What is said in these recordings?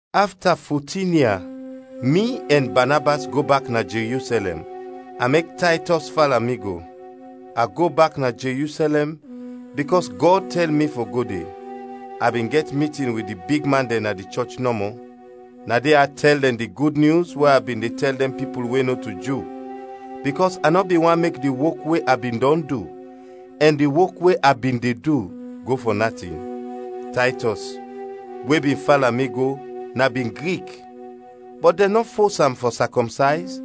Afta fotin ia, mi ɛn Banabas go bak na Jerusɛlɛm, a mek Taytɔs fala mi go. A go bak na Jerusɛlɛm, bikɔs Gɔd tɛl mi fɔ go de. A bin gɛt mitin wit di bigman dɛn na di chɔch nɔmɔ. Na de a tɛl dɛn di Gud Nyus we a bin de tɛl dɛn pipul we nɔto Ju, bikɔs a nɔ bin want mek di wok we a bin dɔn du, ɛn di wok we a bin de du, go fɔ natin. Taytɔs, we bin fala mi go, na bin Grik, bɔt dɛn nɔ fos am fɔ sakɔmsayz,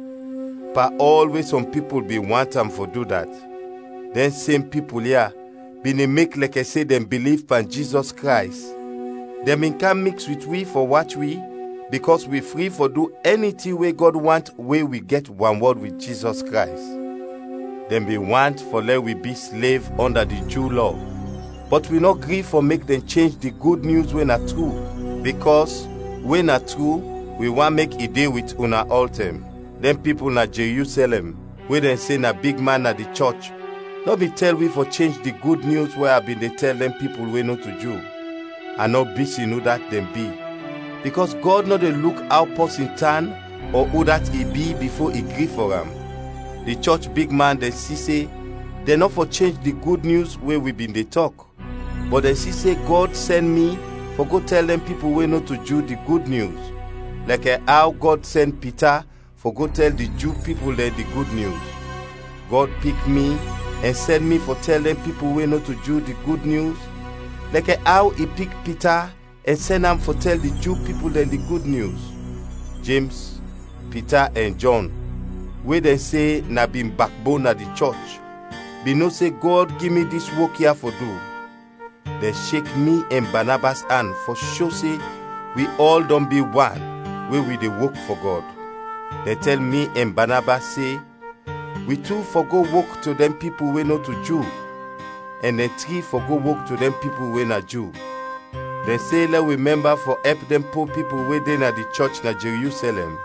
pan ɔl we sɔm pipul bin want am fɔ du dat. Dɛn sem pipul ya bin de mek lɛkɛ se dɛn biliv pan Jizɔs Krays, dɛn bin kam miks wit wi fɔ wach wi bikɔs wi fri fɔ du ɛni tin we Gɔd want we wi gɛt wanwɔd wit Jizɔs Krays. Dɛn bin want fɔ lɛ wi bi slev ɔnda di Ju Lɔ, bɔt wi nɔ gri fɔ mek dɛn chenj di Gud Nyus we na tru, bikɔs, we na tru, wi want mek i de wit una ɔltɛm. Dɛn pipul na Jerusɛlɛm we dɛn se na bigman na di chɔch nɔ bin tɛl wi fɔ chenj di Gud Nyus we a bin de tɛl dɛn pipul we nɔto Ju. A nɔ bisin udat dɛn bi, bikɔs Gɔd nɔ de luk aw pɔsin tan ɔ udat i bi bifo i gri fɔ am. Di chɔch bigman dɛn si se dɛn nɔ fɔ chenj di Gud Nyus we wi bin de tɔk, bɔt dɛn si se Gɔd sɛn mi fɔ go tɛl dɛn pipul we nɔto Ju di Gud Nyus, lɛkɛ aw Gɔd sɛn Pita fɔ go tɛl di Ju pipul dɛn di Gud Nyus. Gɔd pik mi ɛn sɛn mi fɔ tɛl dɛn pipul we nɔto Ju di Gud Nyus, lɛkɛ aw i pik Pita ɛn sɛn am fɔ tɛl di Ju pipul dɛn di Gud Nyus. Jems, Pita ɛn Jɔn, we dɛn se na bin bakbon na di chɔch bin no se Gɔd gi mi dis wok ya fɔ du, dɛn shek mi ɛn Banabas an fɔ sho se wi ɔl dɔn bi wan we wi de wok fɔ Gɔd. Dɛn tɛl mi ɛn Banabas se, wi tu fɔ go wok to dɛn pipul we nɔto Ju, ɛn dɛn tri fɔ go wok to dɛn pipul we na Ju. Dɛn se lɛ wi mɛmba fɔ ɛp dɛn po pipul we de na di chɔch na Jerusɛlɛm,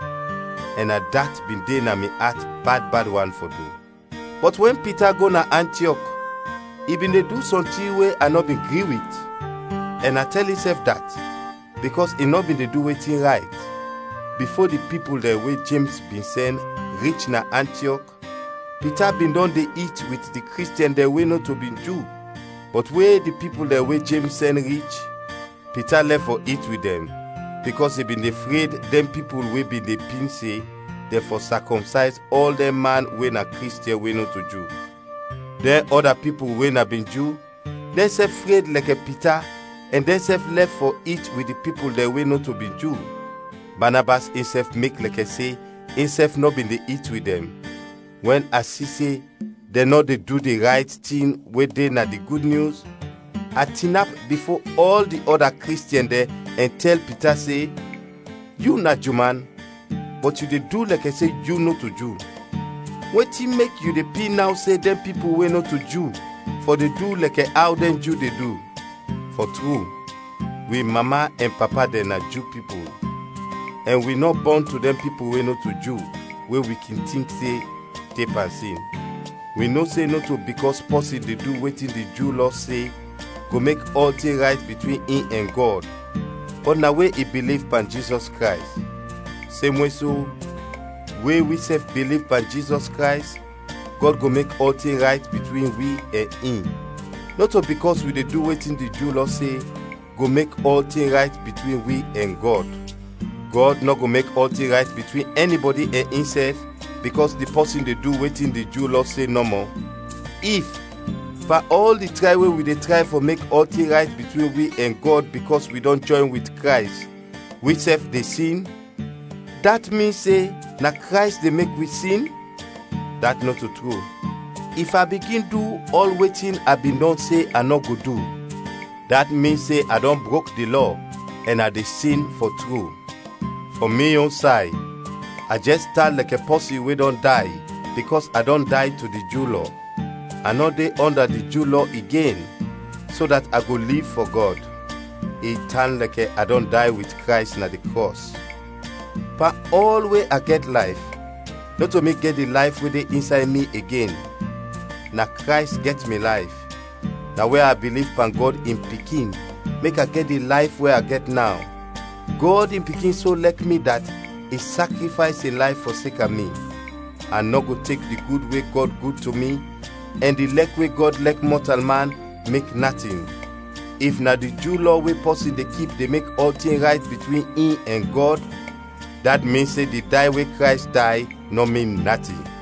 ɛn na dat bin de na mi at bad bad wan fɔ du. Bɔt wɛn Pita go na Antiɔk, i bin de du sɔntin we a nɔ bin gri wit, ɛn a tɛl insɛf dat, bikɔs i nɔ bin de du wetin rayt. Bifo di pipul dɛn we Jems bin sɛn, rich na Antiɔk, Pita bin dɔn de it wit di Kristiɛn dɛn we nɔto bin Ju, bɔt we di pipul dɛn we Jems sɛn rich, Pita lɛf fɔ it wit dɛn, bikɔs i bin de fred dɛn pipul we bin de pin se, dɛn fɔ sakɔmsayz ɔl dɛn man we na Kristiɛn we nɔto Ju. Dɛn ɔda pipul we na bin Ju, dɛnsɛf fred lɛkɛ Pita ɛn dɛnsɛf lɛf fɔ it wit di pipul dɛn we nɔto bin Ju. Banabas insɛf mek lɛkɛ se insɛf nɔ bin de it wit dɛn. Wɛn a si se dɛn nɔ de du di rayt tin we de na di Gud Nyus, a tinap bifo ɔl di ɔda Kristiɛn dɛn ɛn tɛl Pita se, “Yu na Ju man, bɔt yu de du lɛkɛ se yu nɔto Ju. Wetin mek yu de pin naw se dɛn pipul we nɔto Ju fɔ de du lɛkɛ aw dɛn Ju de du?” Fɔ tru, wi mama ɛn papa dɛn na Ju pipul, ɛn wi nɔ bɔn to dɛn pipul we nɔto Ju we wi kin tink se de pan sin. Wi no se nɔto bikɔs pɔsin de du wetin di Ju Lɔ se go mek ɔltin rayt bitwin in ɛn Gɔd, bɔt na we i biliv pan Jizɔs Krays. Semwe so, we wisɛf biliv pan Jizɔs Krays, Gɔd go mek ɔltin rayt bitwin wi ɛn in. Nɔto bikɔs wi de du wetin di Ju Lɔ se, go mek ɔltin rayt bitwin wi ɛn Gɔd. Gɔd nɔ go mek ɔltin rayt bitwin ɛnibɔdi ɛn insɛf bikɔs di pɔsin de du wetin di Ju Lɔ se nɔmɔ. If, pan ɔl di tray we wi de tray fɔ mek ɔltin rayt bitwin wi ɛn Gɔd bikɔs wi dɔn jɔyn wit Krays, wisɛf de sin, dat min se na Krays de mek wi sin? Dat nɔto tru! If a bigin du ɔl wetin a bin dɔn se a nɔ go du, dat min se a dɔn brok di Lɔ ɛn a de sin fɔ tru. Fɔ mi yon say, a jɛs tan lɛkɛ pɔsin we dɔn day bikɔs a dɔn day to di Ju Lɔ; a nɔ de ɔnda di Ju Lɔ igen, so dat a go liv fɔ Gɔd. I tan lɛkɛ a dɔn day wit Krays na di krɔs. Pan ɔl we a gɛt layf, nɔto mi gɛt di layf we de insay mi igen, na Krays gɛt mi layf. Na we a biliv pan Gɔd in Pikin mek a gɛt di layf we a gɛt naw. Gɔd in Pikin so lɛk mi dat i sakrifays in layf fɔseka mi. A nɔ go tek di gud we Gɔd gud to mi ɛn di lɛk we Gɔd lɛk mɔtalman, mek natin. If na di Ju Lɔ we pɔsin de kip de mek ɔltin rayt bitwin in ɛn Gɔd, dat min se di day we Krays day nɔ min natin!